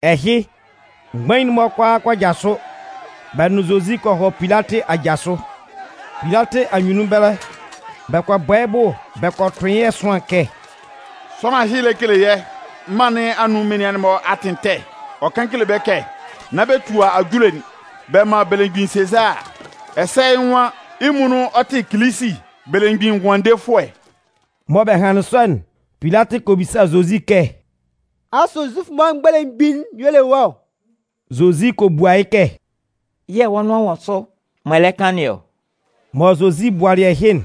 Ɛhɩ, mgbain'n-mɔ kʋalaa kɔ jasʋ, bɛ nʋn Zozi kɔ hɔ Pilatɩ aja sʋ. Pilatɩ anyunnun ɛbɛlɛ, bɛ kɔ bɔ yɩ́ bʋ bɛ kɔ tʋn yɩ́ ɛsʋan kɛ: “Sʋanlan ɛhɩ lɛ kele yɛ́ mân nɩn anun menian'n-mɔ atɩn ɛtɛ. Ɔ kan kele bɛ́ kɛ nán man bɛ tua ajule'n bɛ man belemgbin Sezaa. Ɛsɛ yɩ́ nwan yɩ́ muonun ɔ tɩ Kilisi, Belemgbin Ngʋandefʋɛ.” Mɔ bɛ hanlɩn sɔ'n, Pilatɩ kɔ bisa Zozi kɛ: “Asʋ Zufʋ'n-mɔ belemgbin'n y'ɔ le wɔ́ ɔ?” Zozi kɔ bua yɩ́ kɛ: “Yɛ̂ wɔ́ nʋan wɔ sʋ m'ɔ lɛ kan nɩn ɔ.” Mɔ Zozi bualɩ ɛhɩ'n,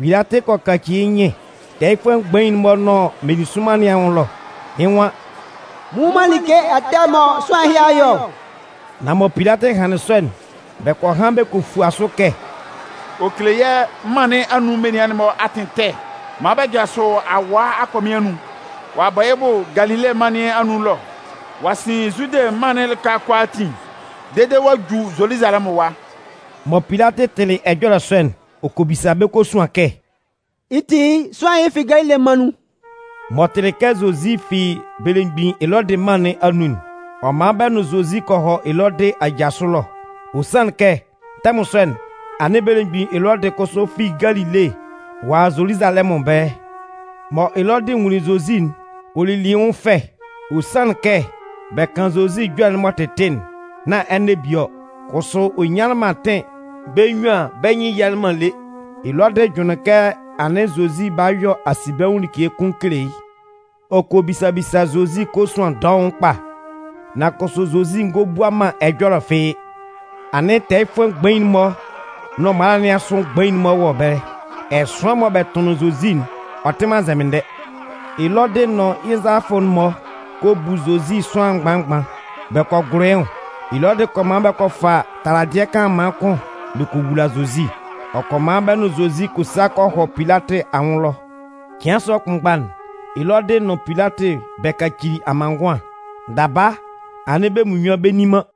Pilatɩ kɔ kaci yɩ́ nyɩn tɛɛyɩfʋɛ mgbain'n-mɔ nʋn meninsʋnman nɩn anwʋn ɛlɔ. Yɩ́ nwan: “Mɩn nnwun man like ɛtɛ mɔ sʋanlan ɛhɩ a yɔ ɔ.” Nan mɔ Pilatɩ hanlɩn sɔ'n, bɛ kɔ han bɛ kɔ fua sʋ kɛ: “Ɔ kele yɛ́ mân nɩn anun menian'n-mɔ atɩn ɛtɛ maan bɛ jasʋ awaa akɔmɩn anun. Ɔ'a bɔ yɩ́ bʋ Galile mân nɩn anun ɛlɔ, ɔ'a sɩn Zude mân'n lɩka kʋalaatin dede ɔ'a ju Zoluzalɛmʋn ɛwa.” Mɔ Pilatɩ tɩlɩ ɛjɔlɛ sɔ'n, ɔ kɔ bisa bɛ́ kosuan kɛ: “Yɩ́ ti, sʋanlan ɛhɩ fi Galile mân nun?” M'ɔ tɩlɩ kɛ Zozi fi belemgbin Elɔdɩ mân nɩn anun'n, ɔ man bɛ nʋn Zozi kɔ hɔ Elɔdɩ aja sʋ ɛlɔ. Ɔ sanlɩn kɛ, tɛmʋn sɔ'n, anɩn belemgbin Elɔdɩ kʋsʋ fi Galile ɔ a Zoluzalɛmʋn ɛbɛlɛ. Mɔ Elɔdɩ nwunlin Zozi'n, ɔ lili yɩ́ nwʋn fɛ. Ɔ sanlɩn kɛ bɛ kan Zozi ɛjɔlɛ'n m'ɔ tɩtɩ'n, nán ɛnɛ bie ɔ. Kʋsʋ ɔ nyanlɩn man atɩn bɛ́ nnyuan bɛ́ nyɩn yialɩ man lé. Elɔdɩ jʋnlɩn kɛ anɩn Zozi 'ba yɔ asinbɛnwʋn like kʋn kele yɩ́. Ɔ kɔ bisa bisa Zozi kosuan dɔʋn kpa. Nan kʋsʋ Zozi ngɔ bua man ɛjɔlɛ fɩ́ɩ́. Anɩn tɛɛyɩfʋɛ mgbain'n-mɔ nʋn mala nɩn asʋ mgbain'n-mɔ wɔ ɛbɛlɛ. Ɛsʋan mɔ bɛ tʋnlɩn Zozi'n, ɔ tɩ man nzɛmɩndɛ. Elɔdɩ nʋn yɩ́ nzalafʋ'n-mɔ kɔ bu Zozi sʋanlan mgban mgban, bɛ kɔ gʋlʋ yɩ́ nwʋn. Elɔdɩ kɔ man bɛ kɔ fa taladɩɛ kanlanman kʋn bɛ kɔ wula Zozi. Ɔ kɔ man bɛ nʋn Zozi kɔ sa kɔ hɔ Pilatɩ anwʋn ɛlɔ. Cɩan sɔ kʋnmgba'n, Elɔdɩ nʋn Pilatɩ bɛ kacili amanngʋan. Daba, anɩn bɛ́ munnyuan bɛ nni man.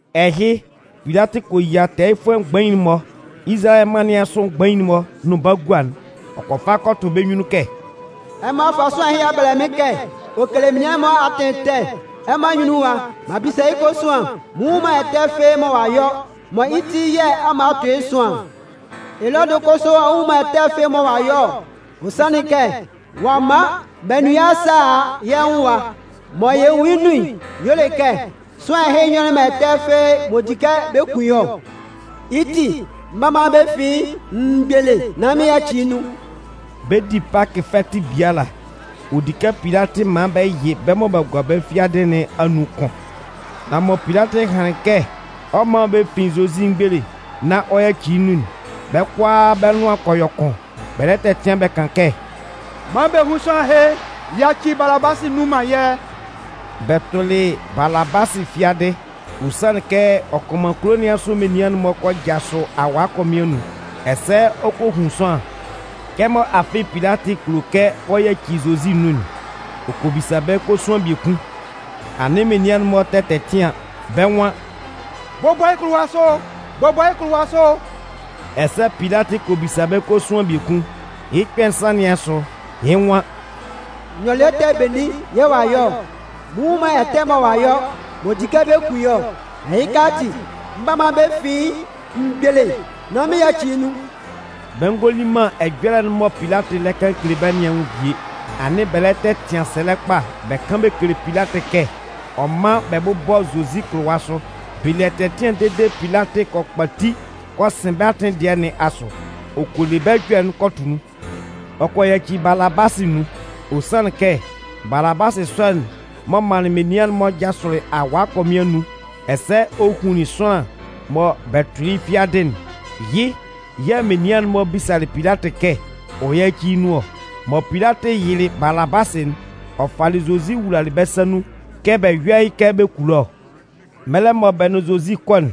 Ɛhɩ, Pilatɩ kɔ yia tɛɛyɩfʋɛ mgbain'n-mɔ, Izalayɛ mân nɩn asʋ mgbain'n-mɔ nʋn bagua'n. Ɔ kɔ fa kɔ tʋ bɛ́ nyunnun kɛ: “Ɛmɔ a fa sʋanlan ɛhɩ a bɛlɛ mɩ́n kɛ ɔ kele menian'n-mɔ atɩn ɛtɛ. Ɛmɔ anyunnun ɛwa, m'an bisa yɩ́ kosuan. Mɩn nnwun man ɛtɛ fɩ́ɩ́ mɔ ɔ'a yɔ, mɔ yɩ́ ti yɛ̂ ɛmɔ a tʋn yɩ́ ɛsʋan'n. Elɔdɩ kʋsʋ a nnwun man ɛtɛ mɔ ɔ'a yɔ ɔ. Ɔ sanlɩn kɛ, ɔ a man bɛ nʋn yɩ́ a sa a a yɛ́ nwʋn ɛwa. Mɔ yɛ nwun yɩ́ nun'n y'ɔ le kɛ sʋanlan ɛhɩ yɔlɩ man ɛtɛ fɩ́ɩ́ m'ɔ di kɛ bɛ kun yɩ́ ɔ. Yɩ́ ti, mɩn 'ba man bɛ fin yɩ́ mgbele nán mɩn yaci yɩ́ nun.” [ Bɛ 'di Pakɩ fɛtɩ biala, ɔ di kɛ Pilatɩ man bɛ yɩ bɛ́ mɔ b'a gua bɛ́ fiadɩ nɩn anun kʋn.] Nan mɔ Pilatɩ hanlɩn kɛ ɔ 'man bɛ fin Zozi mgbele nán ɔ yaci yɩ́ nun'n, bɛ́ kʋalaa bɛ́ nʋan kɔ yɔ kʋn, bɛ lɛ tɛtɩan bɛ kan kɛ: “Man bɛ hún sʋanlan ɛhɩ! Yaci Balabasɩ nun man yɛ́!” (Bɛ tʋlɩ Balabasɩ fiadɩ, ɔ sanlɩn kɛ ɔ kɔ man kulo nɩn asʋ menian'n-mɔ kɔ jasʋ awaa akɔmɩn anun, ɛsɛ ɔ kɔ hun sʋanlan.) Kɛmɔ afɩ Pilatɩ kulo kɛ ɔ yaci Zozi nun'n, ɔ kɔ bisa bɛ́ kosuan biekun. Anɩn menian'n-mɔ tɛ tɛtɩan. Bɛ́ nwan: “Bʋbɔ yɩ́ kʋlʋwa sʋ! Bʋbɔ yɩ́ kʋlʋwa sʋ!” Ɛsɛ Pilatɩ kɔ bisa bɛ́ kosuan biekun. Yɩ́ kpɛ̂ nsan nɩn asʋ, yɩ́ nwan: “Nyɔlɩɛ ɛtɛ benin yɛ̂ ɔ'a yɔ ɔ? Mɩn nnwun man ɛtɛ mɔ ɔ'a yɔ, m'ɔ di kɛ bɛ kun yɩ́ ɔ. Ɛhɩka ati, mɩn 'ba man bɛ fin yɩ́ mgbele nán mɩn yaci yɩ́ nun.” Bɛ ngɔ li man ɛjɔlɛ'n mɔ Pilatɩ lɛ kan kele bɛ́ nɩn anwʋn bie. Anɩn bɛ lɛ tɛtɩan sɛlɛ kpa bɛ kan bɛ kele Pilatɩ kɛ ɔ mán bɛ bʋ́bɔ Zozi kʋlʋwa sʋ. Bɛ le ɛtɛtɩan dede Pilatɩ kɔ kpati kɔ sɩn bɛ́ atɩn dɩɛ nɩn asʋ. Ɔ kɔ le bɛ́ ɛjɔlɛ'n kɔ tʋ nun. Ɔ kɔ yaci Balabasɩ nun. Ɔ sanlɩn kɛ Balabasɩ sɔ'n m'ɔ manlɩn menian'n-mɔ jasʋlɩ awaa akɔmɩn anun ɛsɛ ɔ hunlin sʋanlan mɔ bɛ tʋlɩ yɩ́ fiadɩ'n, yɩ́ yɛ̂ menian'n-mɔ bisalɩ Pilatɩ kɛ ɔ yáci yɩ́ nun ɔ. Mɔ Pilatɩ yɩlɩ Balabasɩ'n, ɔ falɩ Zozi wulalɩ bɛ́ sa nun kɛ bɛ yɔ́ yɩ́ kɛ bɛ kulo ɔ. Mɛlɛ mɔ bɛ nʋn Zozi 'kɔ'n,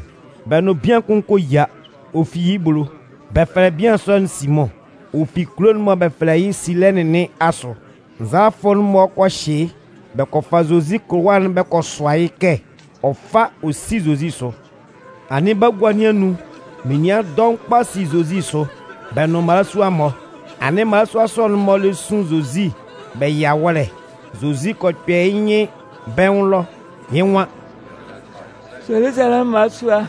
bɛ nʋn bian kʋn kɔ yia, ɔ fi yɩ́ ebolo. Bɛ fɛlɛ bian sɔ'n Simʋn. Ɔ fi kulo'n mɔ bɛ fɛlɛ yɩ́ Silɛnɩn nɩn asʋ. Nzalafʋ'n-mɔ kɔ hyɩ yɩ́, bɛ kɔ fa Zozi kʋlʋwa'n bɛ kɔ sʋa yɩ́ kɛ ɔ fá ɔ sí Zozi sʋ. Anɩn bagua nɩn anun menian dɔʋn kpa si Zozi sʋ, bɛ nʋn mmalasua-mɔ. Anɩn mmalasua sɔ'n-mɔ lɛ sun Zozi bɛ yɩ awɔ́lɛ. Zozi kɔ kpɛ yɩ́ nyɩn bɛ́ nwʋn ɛlɔ, yɩ́ nwan: “Zoluzalɛmʋn mmalasua,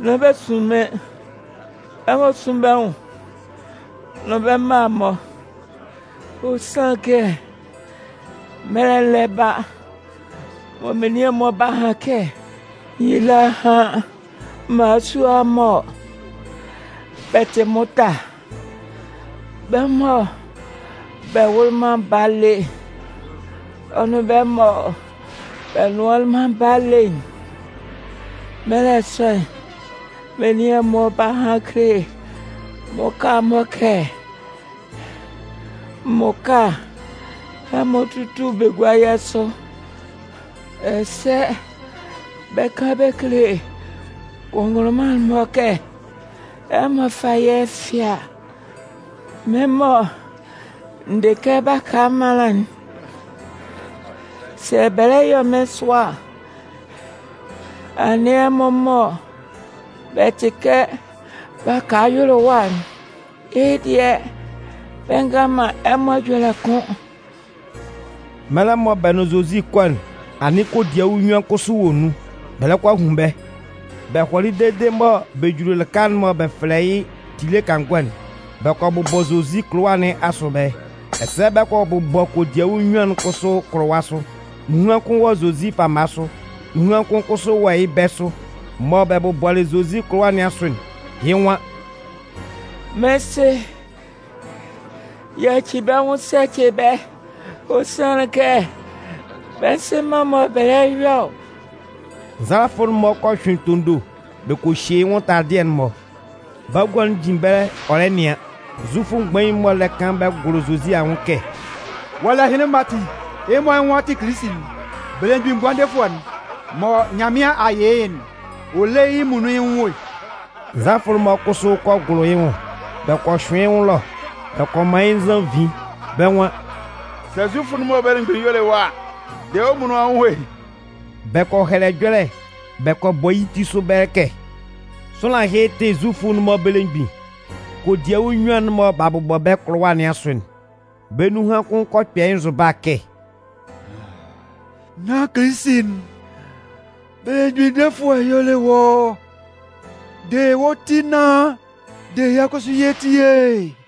nán bɛ sun mɩ́n! Ɛmɔ sún bɛ́ nwʋn nʋn bɛ́ mma'n-mɔ! Ɔ sanlɩn kɛ mɛlɛ'n lɛ ba mɔ menian'n-mɔ 'ba han kɛ: ‘Nyila hán mmalasua mɔ bɛ tɩ mʋta, bɛ́ mɔ bɛ wʋlɩ man baa lé, ɔ nʋn bɛ́ mɔ bɛ nnʋanlɩn man baa lé'n!’ Mɛlɛ sɔ'n, menian'n-mɔ 'ba han kele mmʋka'n-mɔ kɛ: ‘Mmʋka, ɛmɔ túlu bɛ gúa yɛ́ sʋ!’ Ɛsɛ bɛ 'kan bɛ kele kʋnngʋnlʋnman'n-mɔ kɛ: ‘Ɛmɔ fá yɛ́ fɩ́a!’ Mɩ́n mɔ n dɩ kɛ baka ɛmanlan'n, sɛ bɛ lɛ yɔ mɩ́n sʋa a, anɩn ɛmɔ mɔ bɛ tɩ kɛ baka yʋlʋwa'n, yɩ́ dɩɛ bɛ ngan man ɛmɔ ɛjɔlɛ kʋ́n!” Mɛlɛ mɔ bɛ nʋn Zozi 'kɔ'n, anɩn kodiawu nnyuan kʋsʋ wɔ nun. Bɛ lɛ kɔ a hun bɛ́. Bɛ hɔlɩ dede mɔ bɛ juli lɩka'n mɔ bɛ fɛlɛ yɩ́ “Tile kangɔ'n”, bɛ kɔ bʋbɔ Zozi kʋlʋwa nɩn asʋ ɛbɛlɛ. Ɛsɛ bɛ kɔ bʋbɔ kodiawu nnyuan'n kʋsʋ kʋlʋwa sʋ. Nunhan kʋn wɔ Zozi fama sʋ, nunhan kʋn kʋsʋ wɔ yɩ́ bɛ̂ sʋ. [Mɔ bɛ bʋbɔlɩ Zozi kʋlʋwa nɩn asʋ'n, yɩ́ nwan: “Mɩ́n Sɩ, yaci bɛ́ nwʋn sa ce bɛ́. Ɔ sanlɩn kɛ bɛ nzɩ man mɔ bɛ lɛ yɔ ɔ.”] Nzalafʋ'n-mɔ kɔ hyʋɩn tondo bɛ kɔ hye yɩ́ nwʋn taladɩɛ'n-mɔ. Bagua'n jin ɛbɛlɛ ɔ lɛ nɩan. Zufʋ mgbain'n-mɔ lɛ kan bɛ gʋlʋ Zozi anwʋn kɛ: “Ɔ a le ɛhɩnlɩn-mɔ ati, yɩ́ mɔ yɩ́ nwan ɔ tɩ Kilisi'n, Belemgbin Ngʋandefʋɛ'n, mɔ Nyanmɩan a yɩ yɩ́'n, ɔ lé yɩ́ muonun yɩ́ nwʋn e!” Nzalafʋ'n-mɔ kʋsʋ kɔ gʋlʋ yɩ́ nwʋn. Bɛ kɔ hyʋɩn yɩ́ nwʋn ɛlɔ, bɛ kɔ man yɩ́ nzannvin. Bɛ́ nwan: “Sɛ Zufʋ'n-mɔ belemgbin'n y'ɔ le wɔ́ a, de wɔ́ muonun wɔ́ nwʋn e!” Bɛ kɔ hɛlɛ ɛjɔlɛ bɛ kɔ bɔ yɩ́ ti sʋ ɛbɛlɛ kɛ: “Sʋanlan ɛhɩ tɩ Zufʋ'n-mɔ belemgbin.” Kodiawu nnyuan'n mɔ b'a bʋbɔ bɛ́ kʋlʋwa nɩn asʋ'n, bɛ́ nunhan kʋn kɔ kpɛ yɩ́ nzʋba kɛ: “Nán Kilisi'n, Belemgbin Defʋɛ'n y'ɔ le wɔ́ ɔ? De wɔ́ ti nán de yɛ́ kʋsʋ yɛ́ ti e!”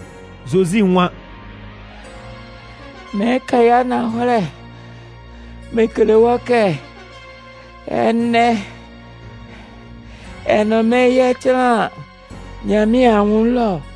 Zozi nwan: “Mɩɩn kan yɩ́ ananhɔlɛ mɩn kele wɔ́ kɛ, ɛnɛ, ɛ nʋn mɩ́n yɛ 'tanlan Nyanmɩan anwʋn ɛlɔ.”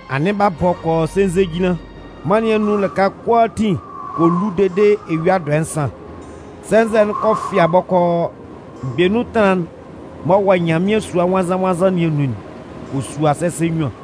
Anɩn b'a bɔ kɔ yɔ sɛnzɛjinlan, mân nɩn anun lɩka kʋalaatin kɔ lu dede eyua dɔɛ nsan. Sɛnzɛ'n kɔ fɩa bɔkɔɔ. Mgbenun ɛtanlan'n m'ɔ wɔ Nyanmɩan Sua Nwannzan-nwannzan nɩn anun'n kɔ sua sɛsɛ nnyuan.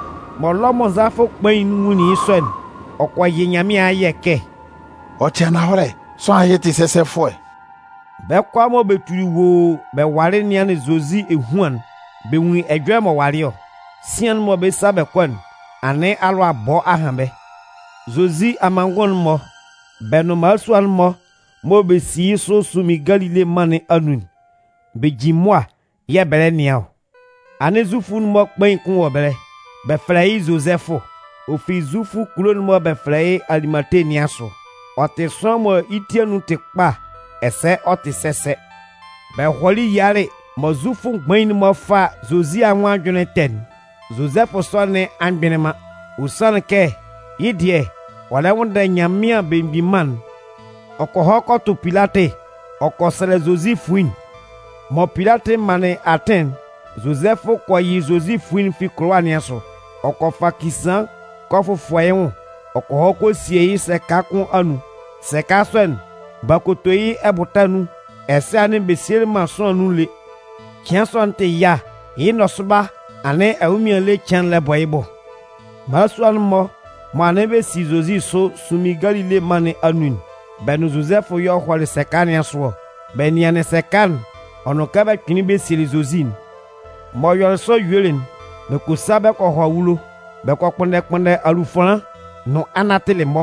Mɔ Lɔmʋn nzalafʋ kpain'n nwʋnlin yɩ́ sɔ'n, ɔ kɔ yɩ Nyanmɩan ayɛ kɛ: “Ɔ tɩ ananhɔlɛ, sʋanlan ɛhɩ tɩ sɛsɛfʋɛ.” Bɛ́ kʋalaa mɔ bɛ tuli woo bɛ walɩ nɩanlɩn Zozi ehuan'n, bɛ nwunlin ɛjɔlɛ m'ɔ walɩ ɔ. Sɩan'n mɔ bɛ 'sa bɛ kɔ'n, anɩn afɩ alʋabɔ a han bɛ́. Zozi amanngʋn'n-mɔ, bɛ́ nʋn mmalasua'n-mɔ mɔ bɛ si yɩ́ sʋ sunmin Galile mân nɩn anun'n, bɛ jin mʋa yɛ̂ bɛ lɛ nɩan ɔ. Anɩn Zufʋ'n-mɔ kpain kʋn wɔ ɛbɛlɛ. Bɛ fɛlɛ yɩ́ Zozɛfʋ. Ɔ fi Zufʋ kulo'n mɔ bɛ fɛlɛ yɩ́ Alimate nɩn asʋ. Ɔ tɩ sʋanlan mɔ yɩ́ ti anun tɩ kpa ɛsɛ ɔ tɩ sɛsɛ. Bɛ hɔlɩ yialɩ mɔ Zufʋ mgbain'n-mɔ 'fa Zozi anwʋn ajʋnlɩn ɛtɛ'n, Zozɛfʋ sɔ nɩn a mgbɩnlɩn man. Ɔ sanlɩn kɛ yɩ́ dɩɛ, ɔ lɛ nwʋnndɛ Nyanmɩan Belemgbin Mân'n. Ɔ kɔ hɔ kɔ tʋ Pilatɩ ɔ kɔ sɛlɛ Zozi fuin'n. Mɔ Pilatɩ manlɩn atɩn'n, Zozɛfʋ kɔ yɩ Zozi fuin'n fi kʋlʋwa nɩn asʋ. Ɔ kɔ fa kisaan kɔ fʋfɔ yɩ́ nwʋn ɔ kɔ hɔ kɔ sie yɩ́ sɛka kʋn anun. Sɛka sɔ'n, b'a koto yɩ́ ɛbʋta nun, ɛsɛ anɩn bɛ sielɩ man sʋanlan nun lé. Cɩan sɔ'n tɩ yâ. Yɩ́ nɔsʋba, anɩn ɛnwʋnmɩan ele cɩan'n lɛ bɔ yɩ́ bʋ. Mmalasua'n-mɔ mɔ anɩn bɛ si Zozi sʋ sunmin Galile mân nɩn anun'n, bɛ nʋn Zozɛfʋ y'ɔ hɔlɩ sɛka nɩn asʋ ɔ. Bɛ nɩanlɩn sɛka'n ɔ nʋn kɛ bɛ kpɩnlɩn bɛ sielɩ Zozi'n. M'ɔ yɔlɩ sɔ yuelɩ'n, bɛ kɔ sa bɛ kɔ hɔ awulo. Bɛ kɔ kpʋnndɛ kpʋnndɛ alufanlan nʋn anatɩlɩ-mɔ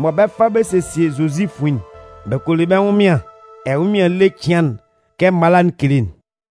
mɔ bɛ 'fa bɛ sesie Zozi fuin'n. Bɛ kɔ le bɛ́ ɛnwʋnmɩan ɛnwʋnmɩan ele cɩan'n kɛ mala'n kele'n.